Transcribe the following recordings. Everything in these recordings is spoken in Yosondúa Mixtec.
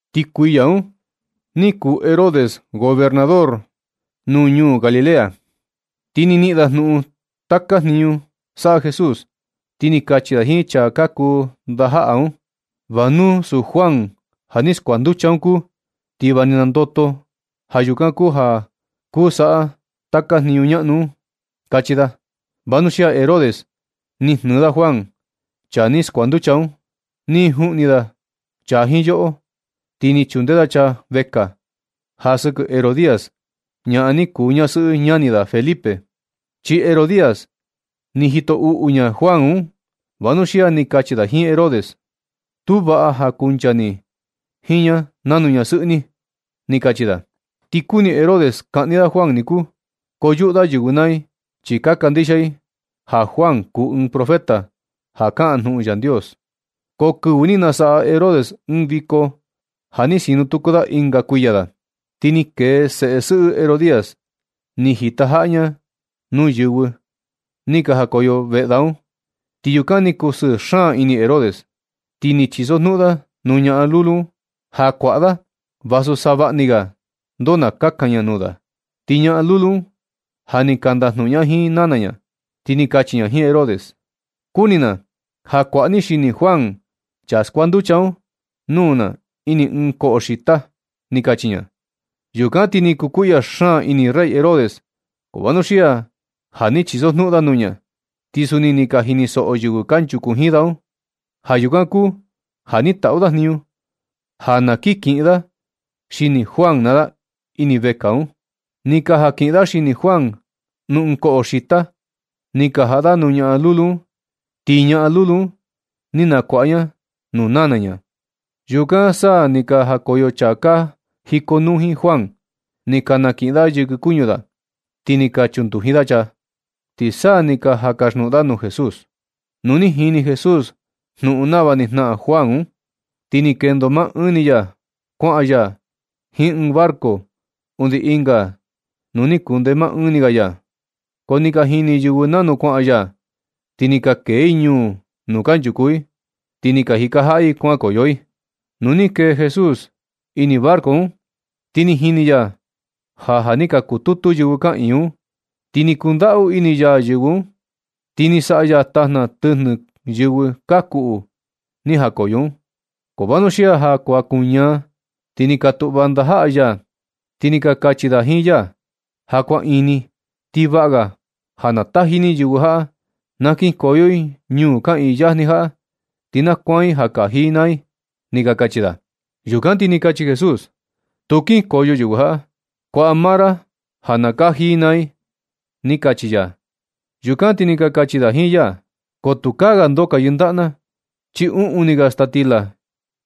Ti kuiya un ni kuu Herodes gobernador nuu ñuu Galilea. Ti ni niꞌin da jnuꞌun taka jniñu saꞌa Jesús. Ti ni kachi da jiin chaa ka kuu ndajaꞌa da un: ―Va nu suu Juan ja ni skuanducha un kuu, ti va ni nandoto. Ja yukan kuu ja kuu saꞌa taka jniñu ñaꞌnu un ―kachi da. Vanuxia Herodes ni jnɨɨ da Juan, chaa ni skuanducha un, ni juꞌni da chaa jiin yoꞌo, ti ni chunde da chaa vekaa ja sɨkɨ Herodías, ñaꞌan ni kuu ñasɨꞌɨ ñani da Felipe. Chi Herodías ni jito uꞌu ña Juan un, vanuxia ni kachi da jiin Herodes: ―Tu vaꞌa ja kuncha ni jiin ña nanu ñasɨꞌɨ ni ―ni kachi da. Ti kuni Herodes kaꞌni da Juan niku, ko yuꞌu da yɨvɨ naa i, chi ka kandixia i ja Juan kuu ɨɨn profeta ja kaꞌan jnuꞌun Yandios. Ko kɨvɨ ni nasaꞌa Herodes ɨɨn viko ja ni sinu tuku da ɨnga kuiya da, ti ni kee seꞌe sɨꞌɨ Herodías, ni jitajaꞌa ña nuu yɨvɨ ni ka jakoyo veꞌe da un, ti yukan ni kusɨɨ xaan ini Herodes. Ti ni chisojnuꞌun da nuu ñaꞌan lulu un ja kuaꞌa da vasu savaꞌani ga ndoo na kakan ña nuu da. Ti ñaꞌan lulu un ja ni ka ndajnuꞌun ña jiin nana ña, ti ni kachi ña jiin Herodes: ―Kuni na ja kuaꞌa ni xini Juan, chaa skuanducha un, nuu na ini ɨɨn koꞌo xita ―ni kachi ña. Yukan ti ni kukuiꞌya xaan ini rey Herodes, ko vanuxia ja ni chisojnuꞌun da nuu ña, ti suni ni ka jinisoꞌo yɨvɨ kanchuku jiin da un. Ja yukan kuu ja ni taꞌu da jniñu ja na kin kiꞌin da xini Juan naa da ini vekaa un. Ni ka jan kiꞌin da xini Juan nuu ɨɨn koꞌo xita, ni ka jaꞌa da nuu ñaꞌan lulu un, ti ñaꞌan lulu un ni nakuaꞌa ña nuu nana ña. Yukan sa ni ka jakoyo chaa ka jikonuu jiin Juan, ni ka nakiꞌin da yɨkɨ kuñu da, ti ni ka chunduji da chaa, ti sa ni ka jan kasjnuꞌun da nuu Jesús. Nu ni jini Jesús jnuꞌun nava ni jnaꞌan Juan un, ti ni kendo maa ɨɨn ni ya kuaꞌan ya jiin ɨɨn barco undi ɨnga nuu ni kunde maa ɨɨn ni ga ya. Ko ni ka jini yɨvɨ nanu kuaꞌan ya, ti ni ka kee i ñuu nuu kanchuku i, ti ni ka jika jaꞌa i kuankoyo i. Nu ni kee Jesús ini barco un, ti ni jini ya ja, ja ni ka kututu yɨvɨ kaꞌiin i un, ti ni kundaꞌu ini ya yɨvɨ un, ti ni saꞌa ya tajna tɨjnɨ yɨvɨ ka kuꞌu ni jakoyo un. Ko vanuxia ja kuan kuñaa, ti ni ka tuꞌva ndajaꞌa ya, ti ni ka kachi da jiin ya: ―Ja kuan ini, ti vaꞌa ga ja na taji ni yɨvɨ jaꞌa na kinkoyo i ñuu kaꞌiin yajni jaꞌa, ti na kuan i ja kaji i naa i ―ni ka kachi da. Yukan ti ni kachi Jesús: ―Tu kinkoyo yɨvɨ jaꞌa. Kuaꞌa ma ra ja na kaji i naa i ―ni kachi ya. Yukan ti ni ka kachi da jiin ya: ―Ko tukaa ga ndoo ka yɨndaꞌa na, chi uꞌun ni ga staa stila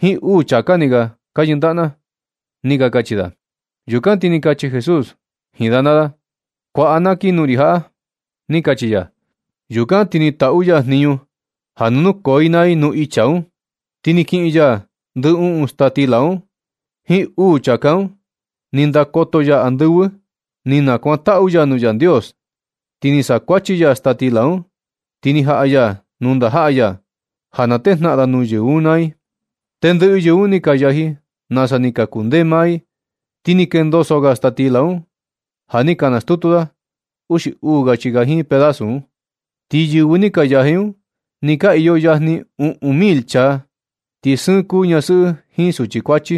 jiin uu chāká ni ga ka yɨndaꞌa na ―ni ka kachi da. Yukan ti ni kachi Jesús jiin da naa da: ―Kuaꞌa na kii nuu ri jaꞌa ―ni kachi ya. Yukan ti ni taꞌu ya jniñu ja na nukoo i naa i nuu icha un. Ti ni kiꞌin ya ndɨ uꞌun staa stila un jiin uu chāká un, ni ndakoto ya andɨvɨ, ni nakuantaꞌu ya nuu Yandios. Ti ni saꞌa kuachi ya staa stila un, ti ni jaꞌa ya nuu ndajaꞌa ya ja na tejnaꞌan da nuu yɨvɨ un naa i. Tendɨꞌɨ yɨvɨ un ni ka yaji, nasa ni kundee maa i. Ti ni kendoso ga staa stila un ja ni ka nastutu da, uxi uu ga chika jiin pedasu un. Ti yɨvɨ ni ka yaji un ni ka iyo yajni uꞌun mil chaa, ti sɨɨn kuu ñasɨꞌɨ jiin suchi kuachi.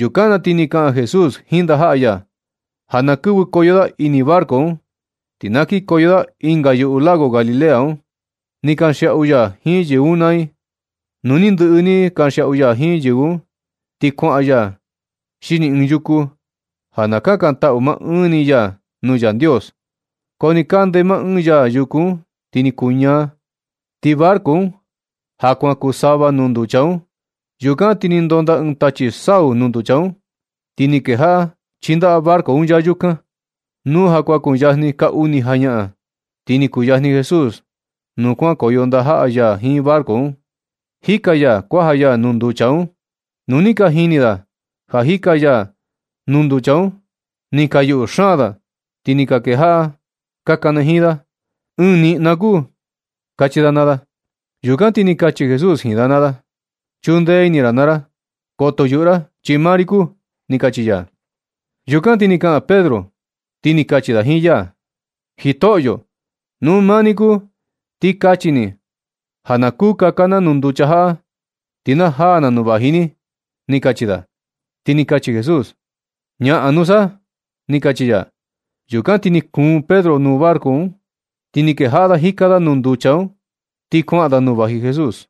Yukan na ti ni kaꞌan Jesús jiin ndajaꞌa ya ja na kɨvɨkoyo da ini barco un, ti na kinkoyo da ɨnga yuꞌu lago Galilea un, ni kanxiaꞌu ya jiin yɨvɨ un naa i. Nu ni ndɨꞌɨ ni kanxiaꞌu ya jiin yɨvɨ un, ti kuaꞌan ya xini ɨɨn yuku ja na kakantaꞌu maa ɨɨn ni ya nuu Yandios, ko nɨ kande maa ɨɨn ya yuku un, ti ni kuñaa. Ti barco un ja kuaꞌan, kuu sava nuu nducha un. Yukan ti ni ndonda ɨɨn tachi sau nuu nducha un, ti ni kejaꞌa chindaꞌa barco un ya yukan. Nu ja kuan kuyajni ka uni jañaꞌan, ti ni kuyajni Jesús nuu kuankoyo ndajaꞌa ya jiin barco un, jika ya kuaja ya nuu nducha un. Nu ni ka jini da ja jika ya nuu nducha un, ni ka yuꞌu xaan da, ti ni ka kejaꞌa ka kanajiin da: ―¡Ɨɨn niꞌna kuu! ―kachi da naa da. Yukan ti ni kachi Jesús jiin da naa da: ―Chunde ini naa ra, koto yuꞌu ra chi maa ri kuu ―ni kachi ya. Yukan sa ni kaꞌan Pedro, ti ni kachi da jiin ya: ―Jitoꞌyo, nu maa ni kuu, ti kachi ni ja na kuu kaka na nuu nducha jaꞌa, ti na jaa na nuu vaji ni ―ni kachi da. Ti ni kachi Jesús: ―Ñaꞌan nusa ―ni kachi ya. Yukan ti ni kuun Pedro nuu barco, ti ni kejaꞌa da jika da nuu nducha un, ti kuaꞌan da nuu vaji Jesús.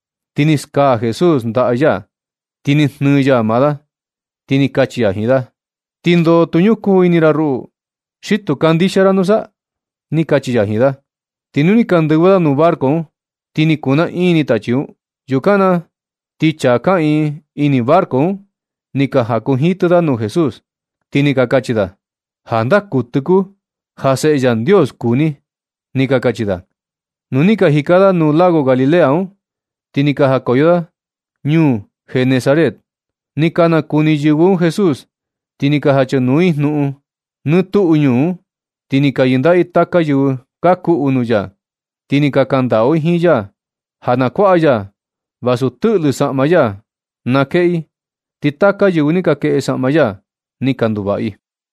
Ti ni skaa Jesús ndaꞌa ya, ti ni jnɨɨ ya maa da, ti ni kachi ya jiin da: ―¿Tindoo tu ñukuu ini ra ruꞌu? ¿Xi tu kandixia ra nusa? ―ni kachi ya jiin da. Ti nu ni ka ndɨvɨ da nuu barco un, ti ni kunaꞌiin tachi un. Yukan na ti chaa kaꞌiin ini barco un, ni ka jakunjitɨ da nuu Jesús, ti ni ka kachi da: ―Jandaa kuɨtɨ kuu, ja Seꞌe Yandios kuu ni ―ni ka kachi da. Nu ni ka jika da nuu lago Galilea un, ti ni ka jakoyo da ñuu Genesaret. Ni ka nakuni yɨvɨ un Jesús, ti ni ka jachanuu i jnuꞌun nɨ tuꞌu ñuu un, ti ni ka yɨndaꞌa i taka yɨvɨ ka kuꞌu nuu ya. Ti ni ka kandaꞌu i jiin ya ja na kuaꞌa ya vasu tɨꞌlɨ saꞌma ya na kueꞌe i, ti taka yɨvɨ ni ka kueꞌe saꞌma ya ni ka nduvaꞌa i.